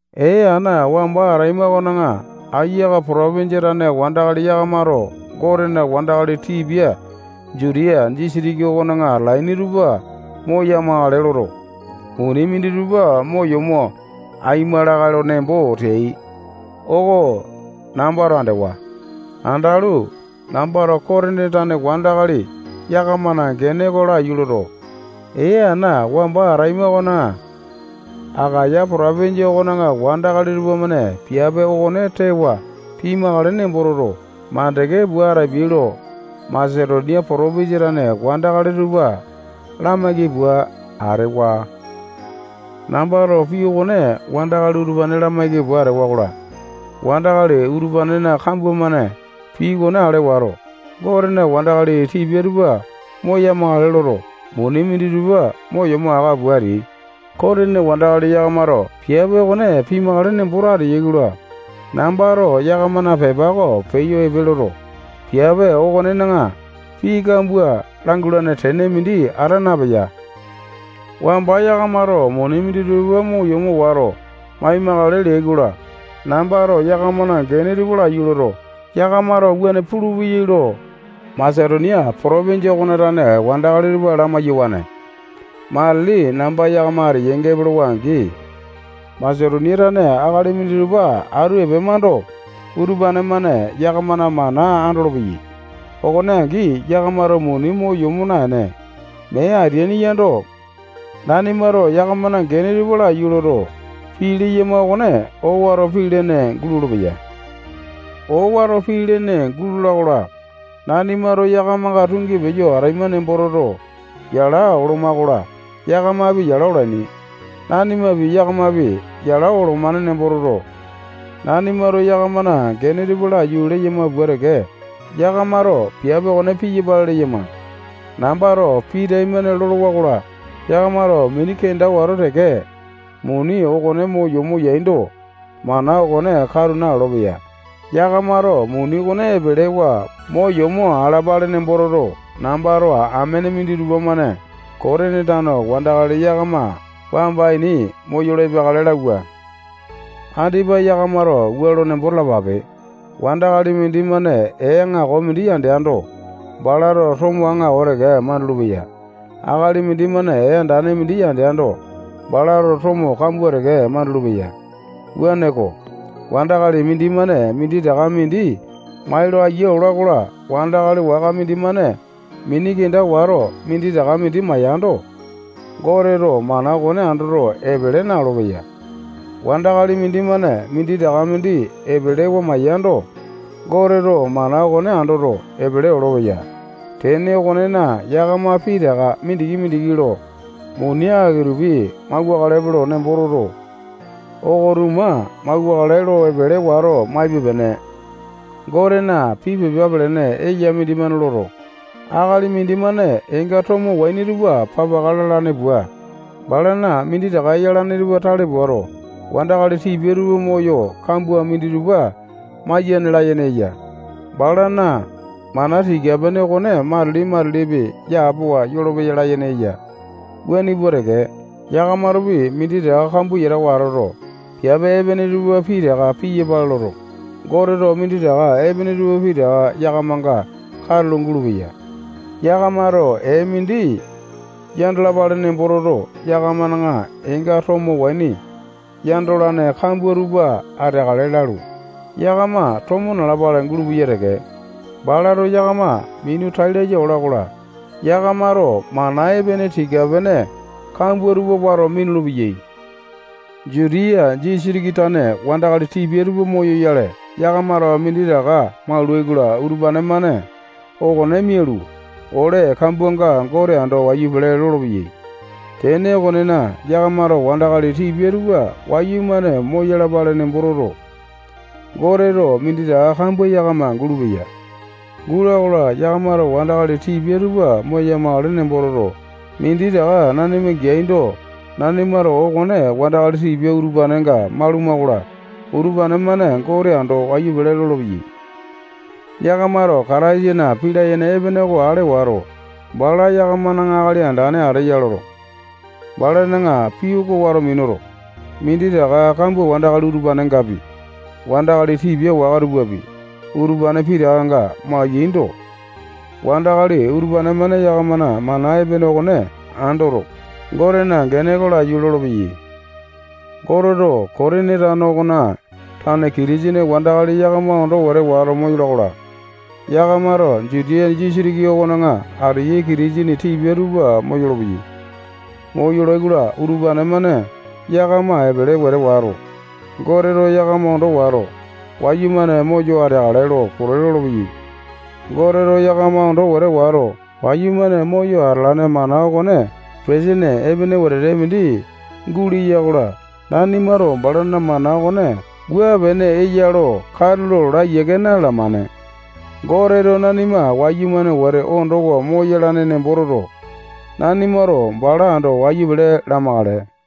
Ee ana wamba ataima okona Akaya potopinjia tane wandakali yakamato Gotena wandakali tipia Jutiya disitiki okona atalaini tupa moya-makale loto, muni minditupa mo yomo aima lakae lo nembo teai oko nambato andewa. Andalu, nambato Kotini tane wandakali yakamana gene oko laiyu loto, ee ana wamba ataima okona Akaya potopinjia okona wandakali tupamane piape okone tewa pimakale nembo toto, mandeke pua atapiai lo Masetonia potopinjia tane wandakali tupa lamaiki pua atewa. Nambato pii okone wandakali utupane lamaiki pua atewa-kola, wandakali utupanena kambua-mane pii okone ale wato, Gotena wandakali tipia tupa moya-makale loto, muni minditupa mo yomo aka pua ateai. Kotini wandakali yakamato piape okone pimakale nemboto ateyai-kola, nambato yakamana pepa oko peyo epe loto, piape okonena pii kambua langulane tene mindi ata napeya. Wamba yakamato muni minditupa mo yomo wato, mai-makale leai-kola, nambato yakamana gene tupa laiyu loto, yakamato wuane pulupeyai lo Masetonia potopinjia okona tane wandakali tupa lamai-yawane. Matili namba yakama ateyainga epolowa-angi, Masetonia tane akali minditupa atu epemando, utupane-mane yakamana mana andolopeyai. Okone angi, yakamato muni mo yomo naene, mee ateaini yando, nanimato yakamana gene tupa laiyu loto, pii leyama okone owato pii lene gulolo-peya. Owato pii lene gulola-kola, nanimato yakamanga tungi peyo ataima nembo toto, yala oloma-kola, yakamapi yala olaini. Nanimapi, yakamapi, yala olomane nembo toto, nanimato yakamana gene tupa laiyu leyama pua teke, yakamato piape okone piyapale leyama. Nambato pii taimane lolowa-kola, yakamato mini kenda wato teke, muni okone mo yomo yaindo, mana okone katu nalolo-peya. Yakamato muni okone epelewa mo yomo alapale nembo toto, nambato amene minditupa-mane Kotini tane wandakali yakama wamba ini moyolo epeakale lauwa. Andipa yakamato wua lo nembo talapape. Wandakali mindimane ee aŋako mindi yandeando, balato tomo aŋako teke mandulu-peya. Akali mindimane ee andane mindi yandeando, balato tomo kambua teke mandulu-peya. Wuaneko, wandakali mindimane minditaka mindi mai lo ayia ola-kola, wandakali waka mindimane mini kenda wato, minditaka mindi maiyando, Goteto mana okone andoto, epele na-olopeya. Wandakali mindimane minditaka mindi epelewa maiyando, Goteto mana okone andoto, epele olopeya. Tene okonena, yakama pitaka mindiki-mindiki lo, muni aki-tupi mauwakalepe nembo toto, oko-tuma mauwakale lo epele wato maipe-pene. Gotena pii pepa pelene eya mindimane loto, akali mindimane eenga tomo waini tupa papaka lalane pua, balana minditaka yalane tupa tale puato, wandakali tipia tupa moyo, kambua minditupa maiyane layene eya. Balana mana tika-pene okone matili-matilipi yapowa yolopeya layene eya. Wuane pua teke, yakamatopi minditaka kambua yatawa atoto, piape epene tupa pitaka piyapale loto, Goteto minditaka epene tupa pitaka yakamanga katulo gulupeya. Yakamato ee mindi yandalapale nembo toto, yakamana eenga tomo waini yandolane kambua tupa ateakale lalu, yakama tomo nalapale gulupeya teke. Balato yakama minu tai laya ola-kola, yakamato mana epene tika-pene kambua tupa wato minulu-peyai. Jutiya disitiki tane wandakali tipia tupa moyoyale, yakamato minditaka maulai-kola, utupane-mane okone mialu, ole kambuanga Gote ando wayu pele lolopeyai. Tene okonena, yakamato wandakali tipia tupa wayumane moyalapale nembo toto, Goteto minditaka kambua yakama gulupeya. Gula-kola, yakamato wandakali tipia tupa moya-makale nembo toto, minditaka nanima geaindo, nanimato okone wandakali tipia utupanenga maluma-kola, utupane-mane Gote ando wayu pele lolopeyai. Yakamato Kataisana pii layene epene oko ale wato, bala yakamana Akali Andane ateya loto, balana pii oko wato minuto, minditaka kambua wandakali utupanengapi, wandakali tipia waka tupapi, utupane pitakanga mai-yaindo, wandakali utupane-mane yakamana mana epene okone andoto, Gotena gene oko laiyu lolopeyai. Goteto Kotini tano okona tane Kitisene wandakali yakama ondo wete wato moyola-kola, yakamato Jutiya disitiki okona ateyai Kitisene tipia tupa moyolo-peyai. Moyolai-kola, utupane-mane yakama epele wete wato, Goteto yakama ondo wato, wayumane moyo ateakale lo pote lolopeyai. Goteto yakama ondo wete wato, wayumane moyo atalane mana okone petesene epene wete mindi guleya-kola, nanimato balana mana okone wua pene eya lo katulo laa yiake napiyamane. Goteto nanima wayumane wete ondowa moyalane nembo toto, nanimato bala ando wayu pele lamakale.